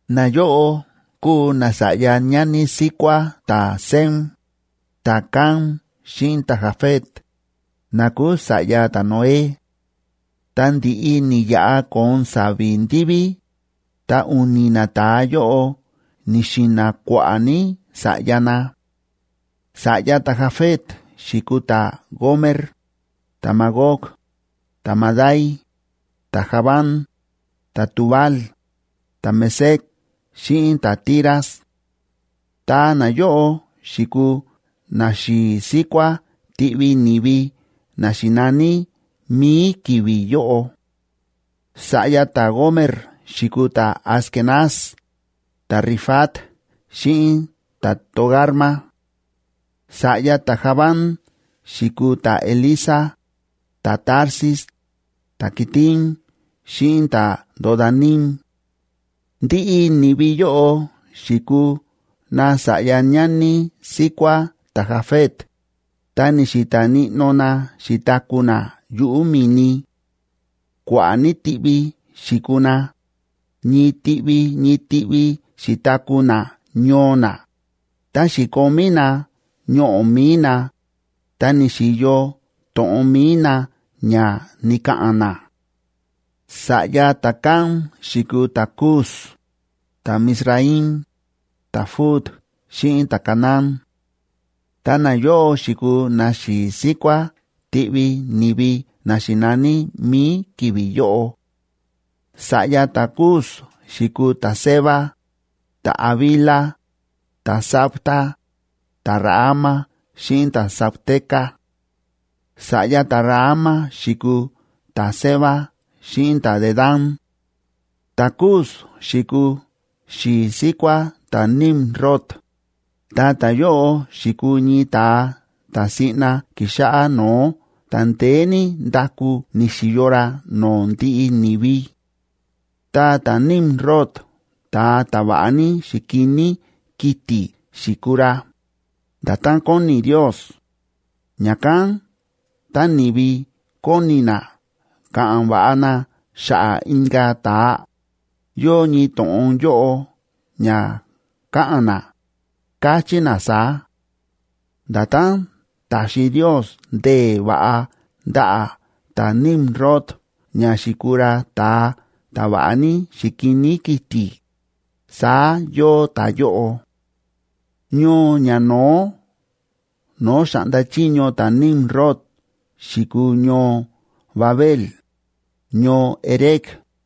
Nayóꞌo kúu nasa̱ꞌya ñani síkuá ta̱Sem, ta̱Cam xíꞌin ta̱Jafet, na kúu sa̱ꞌya ta̱Noé; ta ndi̱ꞌi ni̱yaꞌa ko̱on sa̱vi̱ ndiví, ta u̱ni̱ nata̱a yóꞌo ni̱xi̱na̱ kua̱ꞌa̱ ní sa̱ꞌya na. Sa̱ꞌyaa ta̱Jafet xi̱kuu ta̱Gomer, ta̱Magog, ta̱Madai, ta̱Javán, ta̱Tubal, ta̱Mesec xíꞌin ta̱Tiras. Ta nayóꞌo xi̱kuu naxi̱i̱ síkuá tiꞌvi ni̱vi na xi̱naní mi̱i ki̱vi̱ yóꞌo. Sa̱ꞌya ta̱Gomer xi̱kuu ta̱Askenaz, ta̱Rifat xíꞌin ta̱Togarma. Sa̱ꞌya ta̱Javán xi̱kuu ta̱Elisa, ta̱Tarsis, ta̱Quitim xíꞌin ta̱Dodanim. Ndiꞌi ni̱vi yóꞌo xi̱kuu nasa̱ꞌya ñani síkuá ta̱Jafet, ta ni̱xi̱ta̱ níꞌnó na xi̱taku̱ na yuꞌu̱ mi̱ni; kua̱ꞌa̱ ní tiꞌvi xi̱kuu na, ñii tiꞌvi ñii tiꞌvi xi̱taku̱ na ñoo na, ta xi̱komí na ñoꞌo̱ mi̱i na, ta ni̱xi̱yo to̱ꞌon mi̱i na ña ni̱ka̱ꞌa̱n na. Sa̱ꞌya ta̱Cam xi̱kuu ta̱Cus, ta̱Mizraim,b ta̱Fut xíꞌin ta̱Canaán. Ta nayóꞌo xi̱kuu naxi̱i̱ síkuá tiꞌvi ni̱vi na xi̱naní mi̱i ki̱vi̱ yóꞌo. Sa̱ꞌya ta̱Cus xi̱kuu ta̱Seba, ta̱Havila, ta̱Sabta, ta̱Raama xíꞌin ta̱Sabteca. Sa̱ꞌya ta̱Raama xi̱kuu ta̱Seba xíꞌin ta̱Dedán. Ta̱Cus xi̱kuu xi̱i̱ síkuác ta̱Nimrod, ta ta̱yóꞌo xi̱kuu ñii ta̱a ta̱ siꞌna ki̱xáꞌá no̱ó ta ndeé ní ndaku ni̱xi̱yo ra no̱o̱ ndiꞌi ni̱vi. Ta ta̱Nimrod ta̱a ta̱ va̱ꞌa ní xi̱kiní kiti̱ xi̱kuu ra, nda̱tán kóni Ndios.d Ña̱kán tá ni̱vi kóni na ka̱ꞌa̱n va̱ꞌa na xa̱ꞌa̱ inka̱ ta̱a, yóo ñii to̱ꞌon yóꞌo ña káꞌa̱n na, káchí na saá: “Nda̱tán ta̱xi Ndios ndee̱ va̱ꞌa ndaꞌa̱ ta̱Nimrod ña xi̱kuu ra ta̱a ta̱ va̱ꞌa ní xi̱kiní kiti̱, saá yóo ta̱yóꞌo.” Ñoo ñano̱ó no̱o̱ xa̱ꞌnda chiño ta̱Nimrod xi̱kuu ñoo Babel, ñoo Erec,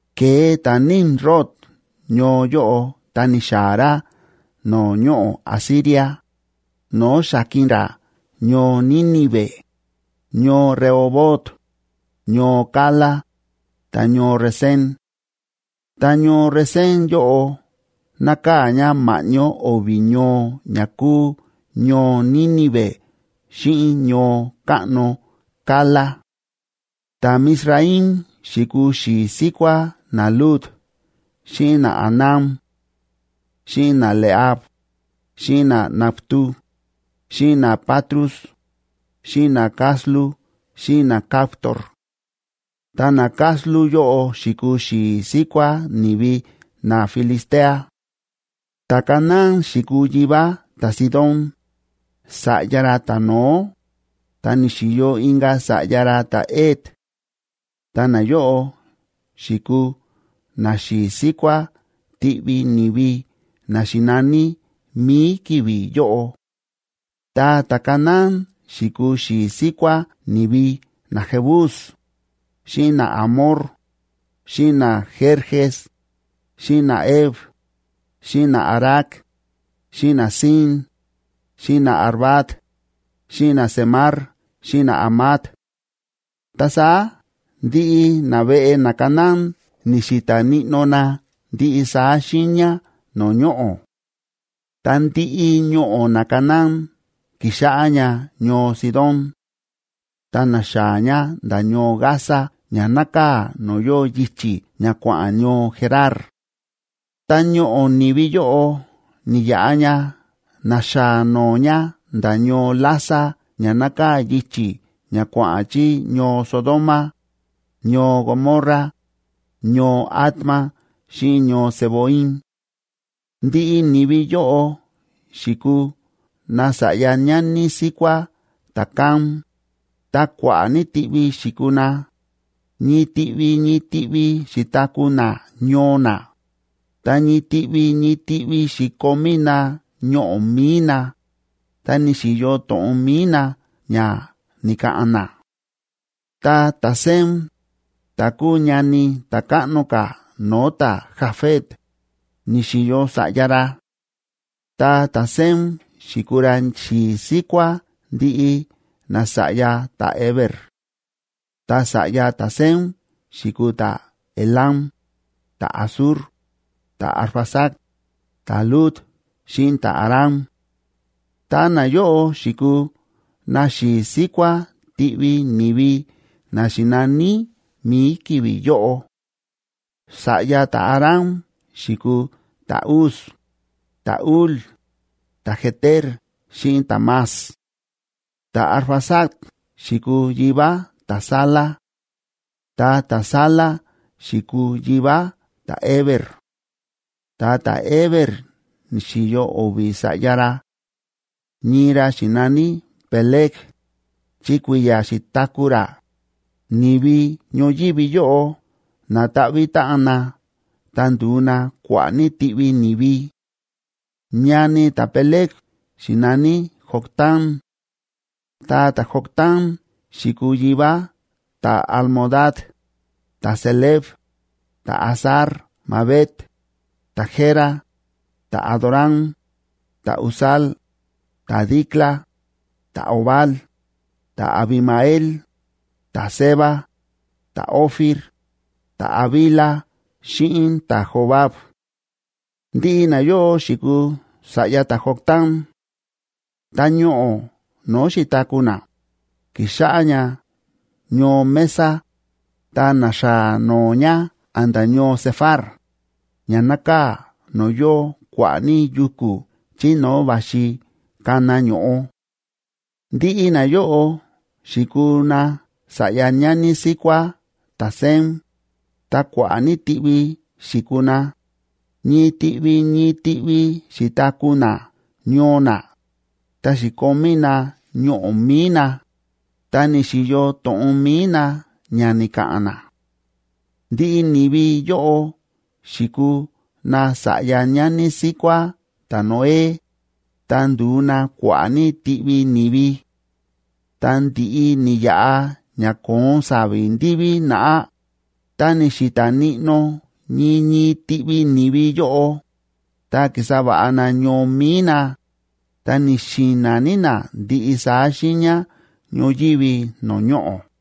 Ke̱e ta̱Nimrod ñoo yóꞌo ta ni̱xaa̱ ra no̱o̱ ñoꞌo̱ Asiria, no̱o̱ xa̱ki̱n ra ñoo Nínive, ñoo Rehobot, ñoo Cala, ta ñoo Resén. Ta ñoo Resén yóꞌo nákaa̱ ña ma̱ꞌñó o̱vi̱ ñoo ña kúu ñoo Nínive xíꞌin ñoo káꞌno Cala. Ta̱Mizraim xi̱kuu xi̱i̱ síkuá naLud xíꞌin naAnam, xíꞌin naLehab, xíꞌin naNaftu, xíꞌin naPatrus, xíꞌin naCaslu xíꞌin naCaftor. Ta naCaslu yóꞌo xi̱kuu xi̱i̱ síkuá ni̱vi naFilistea. Ta̱Canaán xi̱kuu yivá ta̱Sidón, sa̱ꞌya ra ta̱no̱ó, ta ni̱xi̱yo inka̱ sa̱ꞌya ra ta̱Het. Ta nayóꞌo xi̱kuu naxi̱i̱ síkuá tiꞌvi ni̱vi na xi̱naní mi̱i ki̱vi̱ yóꞌo. Ta ta̱Canaán xi̱kuu xi̱i̱ síkuá ni̱vi naJebus, xíꞌin naAmor, xíꞌin naGerges, xíꞌin naHev, xíꞌin naArac, xíꞌin naSin, xíꞌin naArvad, xíꞌin naZemar xíꞌin naHamat. Ta saá ndiꞌi naveꞌe naCanaán ni̱xi̱ta̱ níꞌnó na ndiꞌi saá xiiña no̱o̱ ñoꞌo̱. Ta ndiꞌi ñoꞌo̱ naCanaán ki̱xáꞌá ña ñoo Sidón, ta na̱xaa̱ ña nda̱ ñoo Gaza ña nákaa̱ no̱o̱ yóo yichi̱ ña kua̱ꞌa̱n ñoo Gerar, ta ñoꞌo̱ ni̱vi yóꞌo ni̱yaꞌa ña na̱xaa̱ no̱o̱ ña nda̱ ñoo Lasa ña nákaa̱ yichi̱ ña kua̱ꞌa̱n chí ñoo Sodoma, ñoo Gomorra, ñoo Adma xíꞌin ñoo Zeboim. Ndiꞌi ni̱vi yóꞌo xi̱kuu nasa̱ꞌya ñani síkuá ta̱Cam, ta kua̱ꞌa̱ ní tiꞌvi xi̱kuu na, ñii tiꞌvi ñii tiꞌvi xi̱taku̱ na ñoo na, ta ñii tiꞌvi ñii tiꞌvi xi̱komí na ñoꞌo̱ mi̱i na, ta ni̱xi̱yo to̱ꞌon mi̱i na ña ni̱ka̱ꞌa̱n na. Ta ta̱Sem, ta̱ kúu ñani ta̱ káꞌno ka̱ no̱o̱ ta̱Jafet, ni̱xi̱yo sa̱ꞌya ra. Ta ta̱Sem xi̱kuu ra xi̱i̱ síkuá ndiꞌi nasa̱ꞌya ta̱Heber. Ta sa̱ꞌya ta̱Sem xi̱kuu ta̱Elam, ta̱Asur, ta̱Arfaxad, ta̱Lud xíꞌin ta̱Aram. Ta nayóꞌo xi̱kuu naxi̱i̱ síkuá tiꞌvi ni̱vi na xi̱naní mi̱i ki̱vi̱ yóꞌo. Sa̱ꞌya ta̱Aram xi̱kuu ta̱Uz, ta̱Hul, ta̱Geter xíꞌin ta̱Mas. Ta̱Arfaxad xi̱kuu yivá ta̱Sala. Ta ta̱Sala xi̱kuu yivá ta̱Heber. Ta ta̱Heber ni̱xi̱yo o̱vi̱ sa̱ꞌya ra; ñii ra xi̱naní Peleg,f chi kui̱ya̱ xi̱taku̱ ra, ni̱vi ñoyívi yóꞌo na̱ta̱ꞌvi̱ táꞌan na ta ndu̱u na kua̱ꞌa̱ ní tiꞌvi ni̱vi; ñani ta̱Peleg xi̱naní Joctán. Ta ta̱Joctán xi̱kuu yivá ta̱Almodad, ta̱Selef, ta̱Hazar‑mavet, ta̱Jera, ta̱Adoram, ta̱Uzal, ta̱Dicla, ta̱Obal, ta̱Abimael, ta̱Seba, ta̱Ofir, ta̱Havila xíꞌin ta̱Jobab. Ndiꞌi nayóꞌo xi̱kuu sa̱ꞌya ta̱Joctán. Ta ñoꞌo̱ no̱o̱ xi̱taku̱ na, ki̱xáꞌá ña ñoo Mesa, ta na̱xaa̱ no̱o̱ ña a̱nda̱ ñoo Sefar, ña nákaa̱ no̱o̱ yóo kua̱ꞌa̱ ní yuku̱ chí no̱o̱ va̱xi kana ño̱ꞌo. Ndiꞌi nayóꞌo xi̱kuu nasa̱ꞌya ñani síkuá ta̱Sem, ta kua̱ꞌa̱ ní tiꞌvi xi̱kuu na, ñii tiꞌvi ñii tiꞌvi xi̱taku̱ na ñoo na, ta xi̱komí na ñoꞌo̱ mi̱i na, ta ni̱xi̱yo to̱ꞌon mi̱i na ña ni̱ka̱ꞌa̱n na. Ndiꞌi ni̱vi yóꞌo xi̱kuu nasa̱ꞌya ñani síkuá ta̱Noé, ta ndu̱u na kua̱ꞌa̱ ní tiꞌvi ni̱vi. Tá ndi̱ꞌi ni̱yaꞌa ña ko̱on sa̱vi̱ ndiví naꞌá, ta ni̱xi̱ta̱ níꞌnó ñii ñii tiꞌvi ni̱vi yóꞌo, ta ki̱sa va̱ꞌa na ñoo mi̱i na, ta ni̱xi̱na̱ ní na ndiꞌi saá xiiña ñoyívi no̱o̱ ñoꞌo̱.